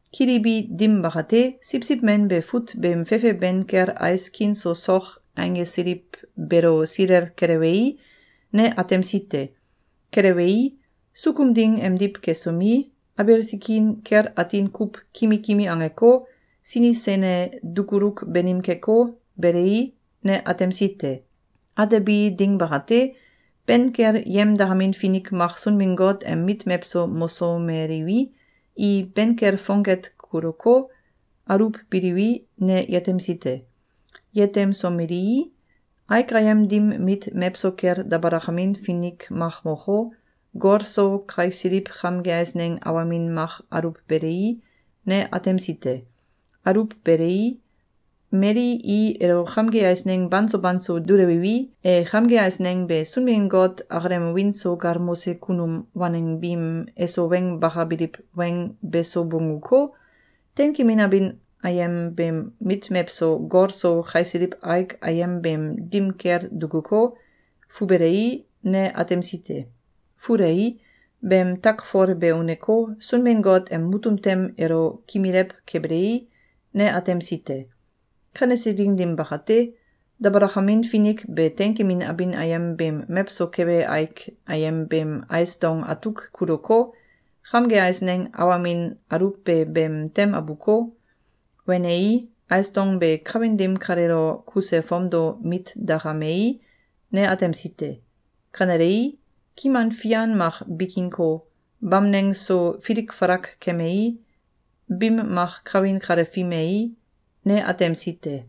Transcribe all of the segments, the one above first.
Kilibi dim bakate, Siwsiw Men be fut beem fefe ben kel ais kin so sok einggesiliw beelo silel kelewei, ne atemsi te. Kelewei, sukum ding emdiw kesomi, abiil tikin kel atin kuw kimi kimi angeko, sini sene dukuluk banim keko, belei, ne atemsi te. Atebi ding bakate, ben kel yemdakamin finik mak Sunbin-Got em mit mewso mosomeliwi, i ben kel fongket kuluko, aluwbiliwi, ne yetemsi te. Yetemsomelii, aik ayem dim mit mewso kel dabalakamin finik mak moko, gol so kaisiliw kamge eisneng awamin mak aluwbelei, ne atemsi te. Aluwbelei, mali i elo kamge eisneng banso banso dulewiwi, e kamge eisneng be Sunbin-Got akalem wiin so galmose kunum waneng biim eso weng bakabiliw weng beso bongguko, teinkemin abin ayem beem mit mewso gol so kaisiliw aik ayem beem dim kel dukuko, fubelei, ne atemsi te. Fulei, beem takfol be uneko, Sunbin-Got em mutum tem elo kimilew kebelei, ne atemsi te. Kanese ding dim bakate, dabalakamin finik be teinkemin abin ayem beem mewso kebe aik ayem beem ais dong atuk kuluko, kamge eisneng awamin aluwbe beem tem abuko, wenei, ais dong be kawin dim kaleelo kuse fomdo mit dakamei, ne atemsi te. Kanelei, kiman fian mak bikinko, bamneng so filik falak kemei, bim mak kawin kale fimei, ne atemsi te.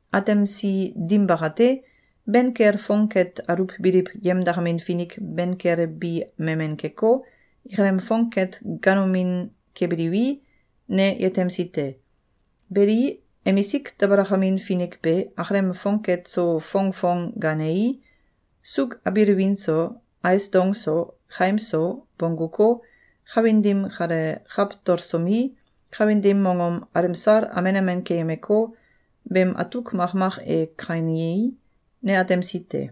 Atemsi dim bakate, ben kel fongket aluwbiliw yemdakamin finik ben kel bi memen keko, ikalem fongket gaanomin kebiliwi, ne yetemsi te. Beli, emisik dabalakamin finik be, akalem fongket so fongfong gaanei, suuk abiil win so, ais dong so, kaim so, bongguko, kawin dim kale kawtolsomi, kawin dim mongom alemsal amen amen keyemeko, beem atuk makmak e kainei, ne atemsi te.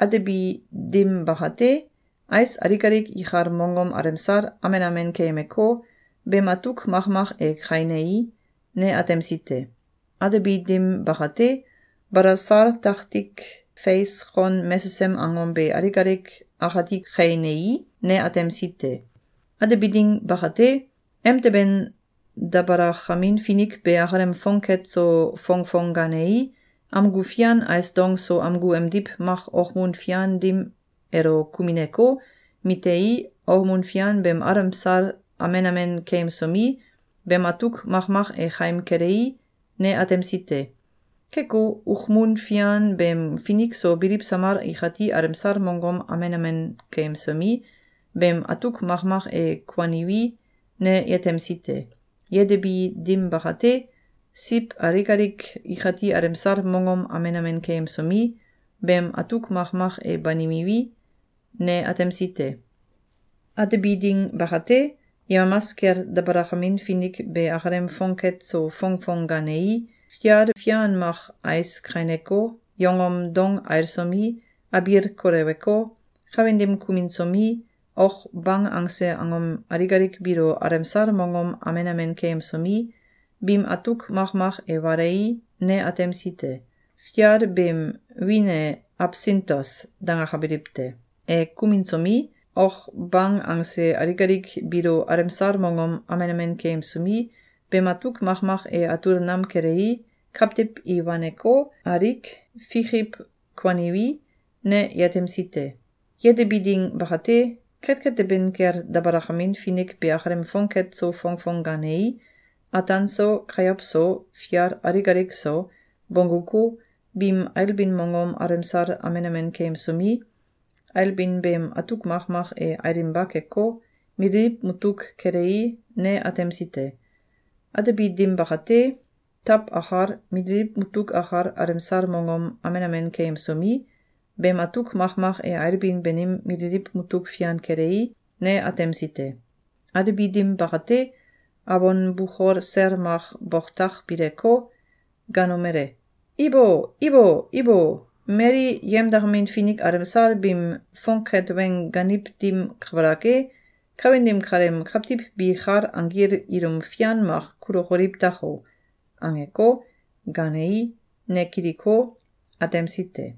Atebi dim bakate, ais alik alik ikal mongom alemsal amen amen keyemeko, beem atuk makmak e kainei, ne atemsi te. Atebi dim bakate, balasal taktik feis kon mesesem angom be alik alik akati kainei, ne atemsi te. Atebi ding bakate, emteben dabalakamin finik be akalem fongket so fongfong gaanei, amgu fian ais dong so amgu emdiw mak okmun fian dim elo kumineko, mitei, okmun fian beem alemsal amen amen keyemsomi, beem atuk makmak e kaim kelei, ne atemsi te. Keko, okmun fian beem finik so biliw samal ikati alemsal mongom amen amen keyemsomi, beem atuk makmak e kuaniwi, ne yetemsi te. Yetebi dim bakate, siw alik alik ikati alemsal mongom amen amen keyemsomi, beem atuk makmak e banimiwi, ne atemsi te. Atebi ding bakate, yemamas kel dabalakamin finik be akalem fongket so fongfong gaanei, fial fian mak ais kaineko, yongom dong ailsomi, abiil koleweko, kawin dim kuminsomi, ok bang angse angom alik alik biilo alemsal mongom amen amen keyemsomi, biim atuk makmak e walei, ne atemsi te. Fial beem wiin e “Absintos!”, dangakabiliw te. E kuminsomi, ok bang angse alik alik biilo alemsal mongom amen amen keyemsomi, beem atuk makmak e atul nam kelei, kawtiw i waneko, alik fikiw kuaniwi, ne yetemsi te. Yetebi ding bakate, ketket teben kel dabalakamin finik be akalem fongket so fongfong gaanei, ataan so, kayow so, fial alik alik so, bongguko, biim ailbin mongom alemsal amen amen keyemsomi, ailbin beem atuk makmak e ailinba keko, mililiw mutuk kelei, ne atemsi te. Atebi dim bakate, taw akal, mililiw mutuk akal alemsal mongom amen amen keyemsomi, beem atuk makmak e ailbin banim mililiw mutuk fian kelei, ne atemsi te. Atebi dim bakate, awon bukol sel mak boktak bileko, gaanomele: “Ibo! Ibo! Ibo! Mali yemdakamin finik alemsal biim fonket weng gaaniw dim kabalak e, kawin dim kaleem kawtiw bi kal anggil ilum fian mak kulokoliw tako!”, angeko, gaanei, ne kiliko, atemsi te.